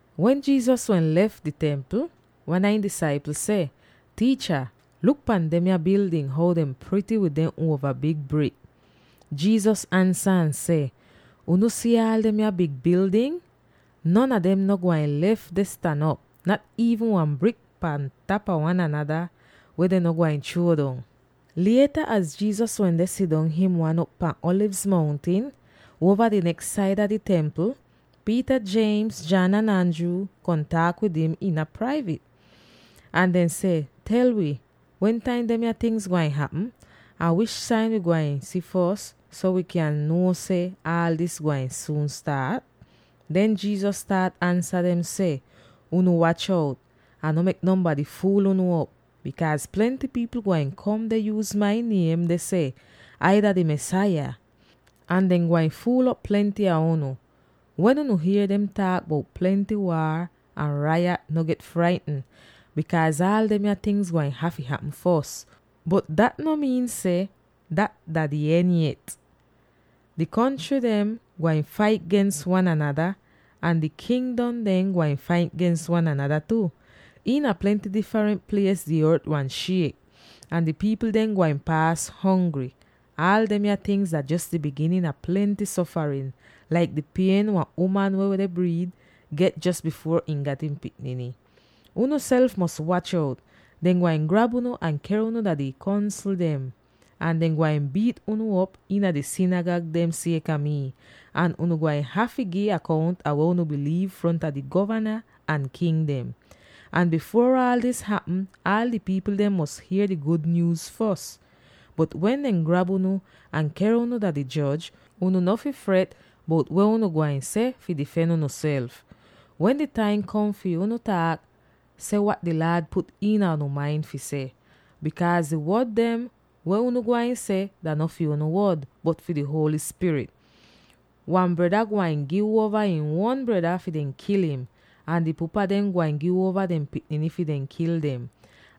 Wen Jesus wende lef di Templ, wan a ihn disaipl seh, “Tiicha, luk pan demya bildin; how dem prity wid dehn uova big brik!” Jesus ansa ahn seh, “Unu si aal demya big bildin? Non a dem no gwain lef deh stan op, nat iivn wan brik pan tapa wan anada, weh dehn no gwain chruo dong.” Lieta, wen Jesus wende sidong him wan op pahn Alivz Mountin, uova di neks saida di Templ, Peter, James, John, ahn Andrew kom taak wid im iina praivit. Ahn dehn seh, “Tel wi, wentaim demya tingz gwain hapm, ahn wish sain wi gwain si fos so wi kyan nuo seh aal dis gwain suun staat?” Den Jesus staat ansa dem seh, “Unu wach out, ahn no mek nonbady fuul unu op, bikaaz plenty pipl gwain kom deh yuuz mai niem deh seh, ‘Ai dah di Mesaya!’ Ahn dehn gwain fuul'op plenty a unu. Wen unu hier dehn taak bout plenty waar ahn rayat, no get fraitn, bikaaz aal demya tingz gwain hafy hapm fos, bot dat no miin seh dat dah di en yet. Di kontry dem gwain fait gens wan anada, ahn di kingdom dem gwain fait gens wan anada tu. Iina plenty difrent plies di ort gwain shiek, ahn di pipl dem gwain paas hongry. Aal demya tingz dah jos di biginin a plenty sofarin, laik di pien wan uman weh deh briid get jos bifuor ihn gat ihn pikniny. “Unuself fi wach out. Dehn gwain grab unu ahn ker unu dah di Kongsl dem. Ahn dehn gwain biit unu op iina di sinigag dem sieka mi, ahn unu gwain hafy gi akount ah weh unu biliiv fronta di govana ahn king dem. Ahn bifuor aal dis hapm, aal di pipl dem mos hier di gud nyuuz fos. Bot wen dehn grab unu ahn ker unu dah di joj, unu no fi fret bout weh unu gwain seh fi difen unuself. Wen di taim kom fi unu taak, seh wat di Laad put iina unu main fi seh, bikaaz di wod dem weh unu gwain seh dah no fi unu wod, bot fi di Holy Spirit. Wan breda gwain gi uova ihn uon breda fi dehn kil im, ahn di pupa dem gwain gi uova dehn pikniny fi dehn kil dem,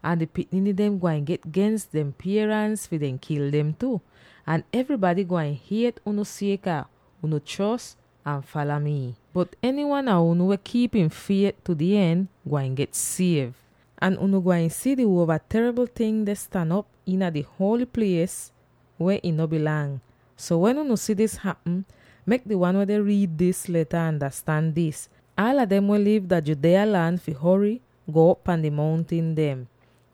ahn di pikniny dem gwain get gens dehn pierans fi dehn kil dem tu. Ahn evrybady gwain hiet unu sieka unu chros ahn fala mii. Bot enywan a unu, weh kiip ihn fiet tu di en, gwain get siev. “Ahn unu gwain si di Uova Teribl Ting deh stan op iina di Holy Plies weh ih no bilang. So wen unu si dis hapm —mek di wan weh deh riid dis leta andastan dis— aala dem weh liv dah Judea lan fi hory, go'op pan di mountin dem.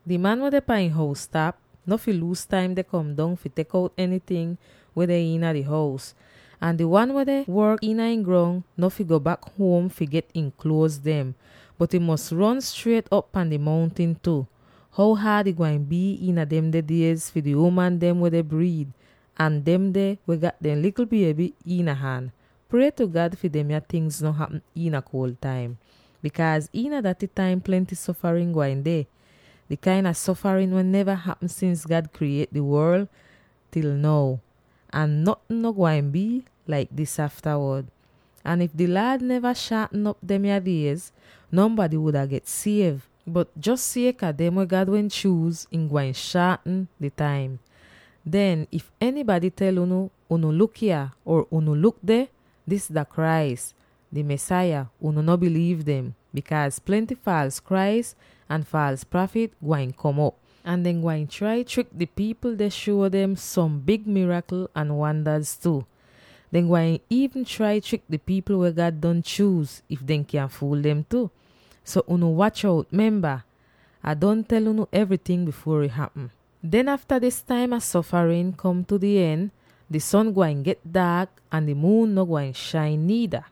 Di man weh deh pan ihn hous-tap no fi luuz taim deh kom dong fi tek out enyting weh deh iina di hous, ahn di wan weh deh work iina ihn grong, no fi go bak huom fi get ihn kluoz dem, bot ihn fi ron striet op pan di mountin tu. How haad ih gwain bii iina demde diez fi di uman dem weh deh briid, ahn demde weh gat dehn likl bieby iina han! Prie tu God fi demya tingz no hapm iina kuol taim, bikaaz iina daty taim plenty sofarin gwain deh, di kain a sofarin weh neva hapm sins God kriyiet di worl til now; ahn notn no gwain bii laik dis aftawod. Ahn if di Laad neva shaatn op demya diez, nonbady wuda get siev; bot jos sieka dem weh God wehn chuuz, ihn gwain shaatn di taim. “Den if enybady tel unu iina daty taim: ‘Unu luk yah!’ or, ‘Unu luk deh! Dis dah Christ, di Mesaya!’ unu no biliiv dem. Bikaaz plenty faals Christ ahn faals prafit gwain kom op. Ahn dehn gwain trai trik di pipl deh shuo dem som big mirakl ahn wandaz tu. Dehn gwain iivn trai trik di pipl weh God don chuuz, if dehn kyan fuul dem tu. So unu wach out! Memba, Ah don tel unu evryting bifuor ih hapm. “Den afta dis taim a sofarin kom tu di en, di son gwain get daak ahn di muun no gwain shain niida.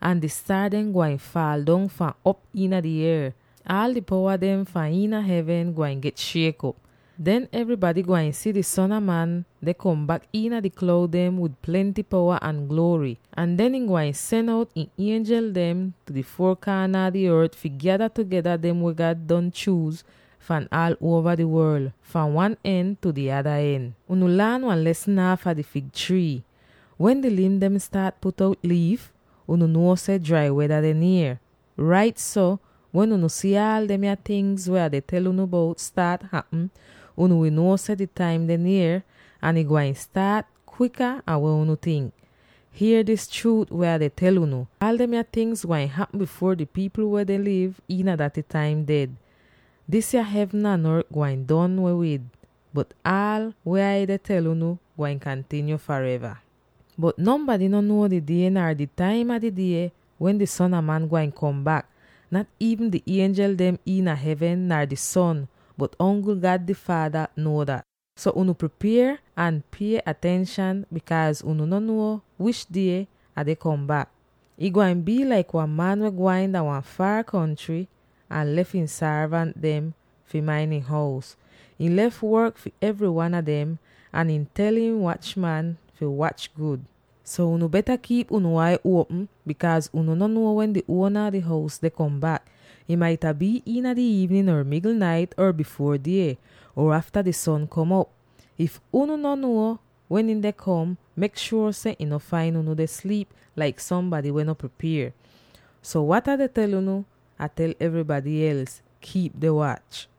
Ahn di staar dem gwain faal dong fahn op iina di ier; aal di powa dem fahn iina hevn gwain get shiek op. Den evrybady gwain si di Son a Man deh kom bak iina di kloud dem wid plenty powa ahn gluory. Ahn den, ihn gwain sen out ihn ienjel dem tu di four kaana a di ort fi gyada tugeda dem weh God don chuuz fahn aal uova di worl, fahn wan en tu di ada en. “Unu laan wan lesn aafa di fig trii: wen di lim dem staat put out liif, unu nuo seh drai weda deh nier. Rait so, wen unu si aal demya tingz weh Ah tel unu bout staat hapm, unu wi nuo seh di taim deh nier, ahn ih gwain staat kwika an weh unu tink. Hier dis chruut weh Ah deh tel unu: Aal demya tingz gwain hapm bifuor di pipl weh deh liv iina daty taim ded. Disya hevn ahn ort gwain don weh wid, bot aal weh Ai deh tel unu gwain kantinyo fareva. “Bot nonbady no nuo di die, nar di taim a di die wen di Son a Man gwain kom bak; nat iivn di ienjel dem iina hevn, nar di Son, bot ongl God di Faada nuo dat. So unu pripier ahn pie atenshan, bikaaz unu no nuo wish die Ah deh kom bak. Ih gwain bii laik wan man weh gwain dah wan foor kontry ahn lef ihn sorvant dem fi main ihn hous. Ihn lef work fi evry wan a dem ahn ihn tel ihn wach-man fi wach gud. So, unu beta kiip unu ai uopm, bikaaz unu no nuo wen di uona a di hous deh kom bak. Ih maita bii iina di iivnin or migl nait or bifuor die or afta di son kom op. If unu no nuo wen ihn deh kom bak, mek shuor seh ihn no fain unu deh sliip laik sombady weh no pripier. So wat Ah tel unu, Ah tel evrybady els: Kiip deh wach!”